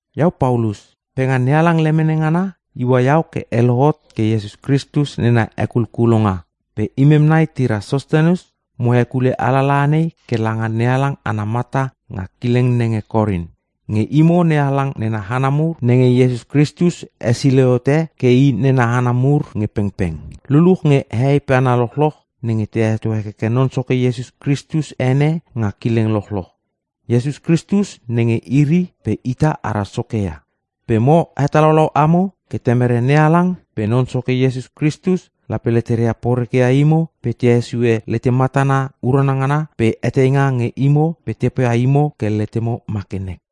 Iau Paulus, pe nga NeHalang lemene ngana iua iau ke e lohot ke iau Iesus Kristus nena hekulkulonga. Pe imem nai tira Sostenes mo hekule alalaha nei ke langa NeHalang ana mata nga kileng nenge Korin. Nge imo NeHalang nena hana mur nenge Iesus Kristus hesilei hote ke I nena hana mur nge pengpeng. Luluch nge hehei pe hana lochloch nenge te heto hekeke Non Soke Iesus Kristus ene nga kileng lochloch. Iesus Kristus nenge iri pe ita ara Soke ia. Pe mo hetalaulau amo ke Temere NeHalang pe Non Soke Iesus Kristus, lape leteria poreke ia imo pe te hesue lete matana urana ngana pe eteinga nge imo pe te poia letemo ke ma kenek.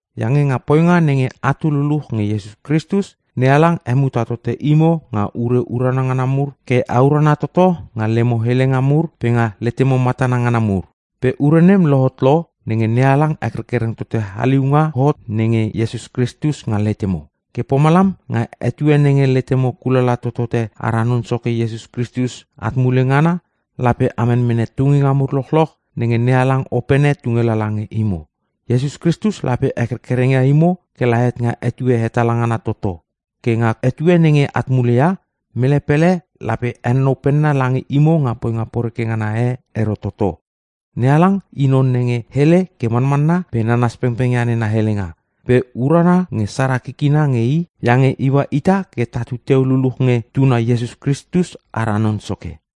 Iange nga poinga nenge atu teu luluch nge Iesus Kristus, NeHalang hemuta tote imo nga ure urana ngana mur ke a urana toto nga lemo helenga mur pe nga letemo matana ngana mur. Pe ure nem lohot lo nenge NeHalang hekerkereng tote haliunga hot nenge Kristus nga letemo. Ke pomalam nga etue nenge letemo kulala totote ara Non Soke Iesus Kristus at mule ngana, lape a menmene tunginga mur lochloch nenge NeHalang opene tunge lala nge imo. Iesus Kristus lape hekerkereng ia imo kela het nga etue hetala ngana toto. Ke nga etue nenge at mule ia, mele pele lape henonou penna lange imo nga poinga poreke ngana e ero toto. NeHalang i non nenge hele ke manmanna pe nanas pengpeng ia nena helenga. Pe urana nge sara kikina nge i iange iua ita ke tatu teu luluch nge Tuna Iesus Kristus ara Non Soke.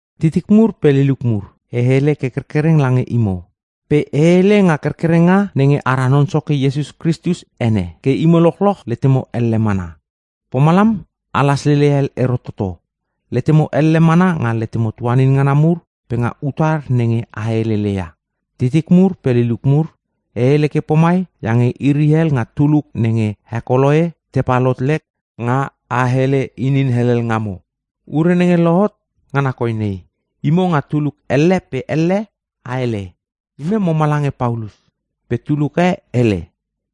Titik mur pe liliuk mur, e hele ke kerkereng lange imo. Pe e hele nga kerkerenga nenge ara Non Soke Iesus Kristus ene, ke imo lochloch letemo elle mana. Pomalam a laslele hel ero toto. Letemo elle mana nga letemo tuanin ngana mur pe nga utar nenge a helele ia. Titik mur pe liliuk mur, e hele ke pomai iange iri hel nga tuluk nenge he Koloe tepal hot lek nga a hele inin helel ngamo. Ure nenge lohotot ngana koi nei: Imo nga tuluk elle pe elle a hele, “Imem moma lange Paulus,” pe tuluk e hele,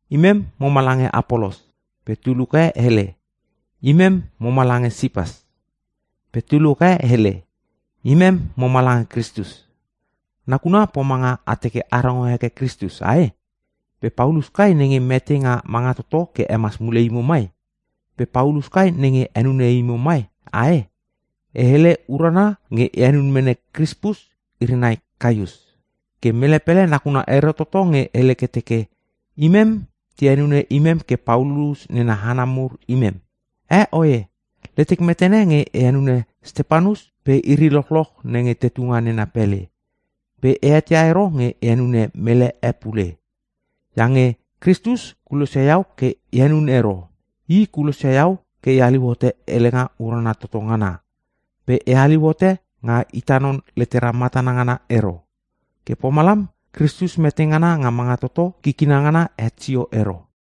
“Imem moma lange Apolos,” pe tuluk e hele, “Imem moma lange Sipas,” pe tuluk e hele, “Imem moma lange Kristus.” Nakuna pomanga a teke a rongo heke Kristus, ae?! Pe Paulus kai nenge mete nga manga toto ke hemas mule imo mai?! Pe Paulus kai nenge henune imo mai, ae?! E hele urana nge e henun mene Krispus iri nai Kaius. Ke mele pele nakuna ero toto nge hele ke teke, “Imem te henune imem ke Paulus nena hana mur imem.” (Eh, oe! Letek metene nge e henune Stepanus pe iri lochloch nenge tetu nga nena pele. Pe e eteia ero nge e henune mele e pule.) Iange Kristus kulosia iau ke e henun ero. I kulosia iau ke e haliu hote helenga Urana Toto Ngana, pe e haliu hote nga ita non letera matana ngara ero. Ke pomalam Kristus metengana nenga mangatoto kikina ngana het sio ero.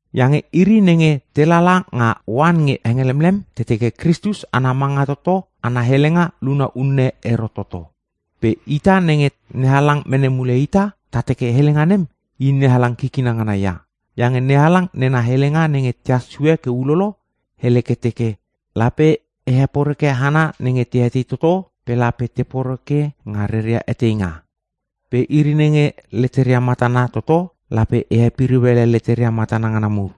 Iange iri nenge te lala nga oan nge hengelemlem te teke Kristus ana manga toto ana helenga luna unne ero toto. Pe ita nenge NeHalang mene mule ita, ta teke helenga nem I NeHalang kikina ngana ia. Iange NeHalang nena helenga nenge tehas sue ke ulolo hele ke teke, “Lape e heporeke hana nenge te etei toto pe lape te poreke nga reria eteinga. Pe iri nenge leteria matana toto, lape e hepiriu ele leteria matana ngana mur.”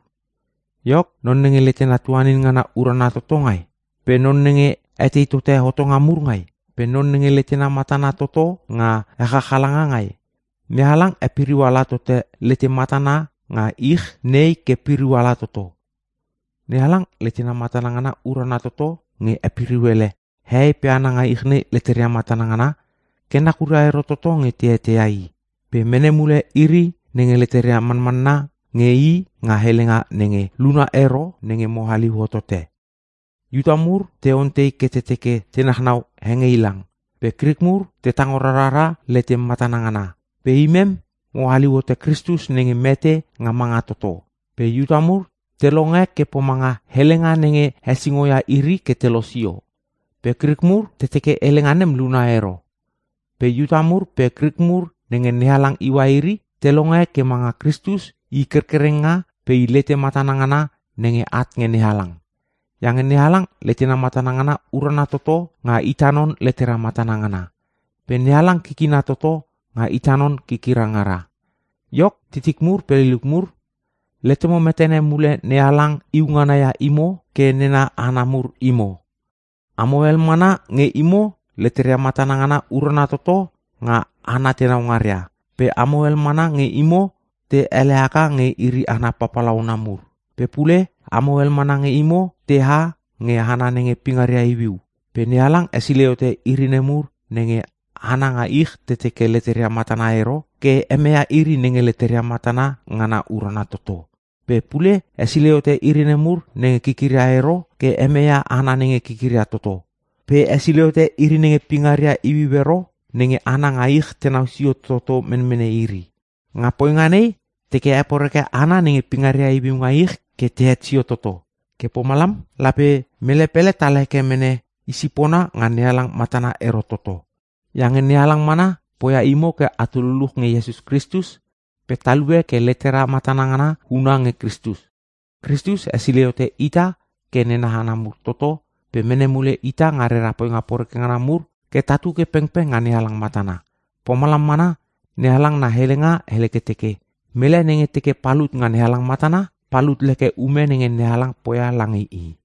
Iok, non nenge letena tuanin ngana urana toto ngai? Pe non nenge etei tote hotonga mur ngai? Pe non nenge letena matana toto nga echachalanga ngai? NeHalang hepiriu ala tote lete matana ngana nga ich nei ke piriu ala toto. NeHalang letena matana ngana urana toto nge hepiriu ele hehei pe hana nga ich leteria matana ngana ke nakuria ero toto nge te eteia I. Pe mene mule iri nenge leteria manmanna nge I nga helenga nenge luna ero nenge mo haliu hotote. Iuta mur te onteitei ke te teke te nachnau hengeilang. Pe Krik mur te tango rarara lete matana ngana. Pe imem mo haliu hote Kristus nenge mete nga manga toto. Pe Iuta mur te longe ke pomanga helenga nenge hesingo ia iri ke te losio, pe Krik mur te teke helenga nem luna unne ero. Pe Iuta mur pe Krik mur nenge NeHalang iua iri, te longe ke manga Kristus I kerkerenga pe I lete matana ngana nenge at nge NeHalang. Iange NeHalang letena matana ngana urana toto nga ita non letera matana ngana. Pe NeHalang kikina toto nga ita non kikira ngara. Iok titik mur pe liliuk mur, letemo metene mule NeHalang iu ngana ia imo ke nena hana mur imo. Amo hel mana nge imo leteria matana ngana urana toto nga hana tenau ngaria. Pe amo hel mana nge imo te ele haka ke iri hana papalauna mur. Pe pule amo hel mana nge imo teha nge hana nenge pingaria iuiu. Pe NeHalang hesilei hote iri nemur nenge hana nga ich te teke leteria matana ero, ke hemeia iri nenge leteria matana ngana urana toto. Pe pule hesilei hote iri nemur nenge kikiria ero ke hemeia hana nenge kikiria toto. Pe hesilei hote iri nenge pingaria iuiu ero nenge hana nga ich tenau sio toto menmene iri. Nga poinga nei, teke heporeke hana nenge pingaria iuiu nga ich ke tehet sio toto. Ke pomalam lape mele pele tal heke mene i sipona nga NeHalang matana ero toto. Iange NeHalang mana poia imo ke atu luluch nge Iesus Kristus, pe talue ke letera matana ngana huna nge Kristus. Kritus hesilei hote ita ke nena hana mur toto pe mene mule ita nga rera poinga poreke ngana ke tatu ke pengpeng nga NeHalang matana. Pomalam mana NeHalang na helenga hele ke teke, “Mele nenge teke palut nga NeHalang matana, palut leke ume nenge NeHalang poia lange i.”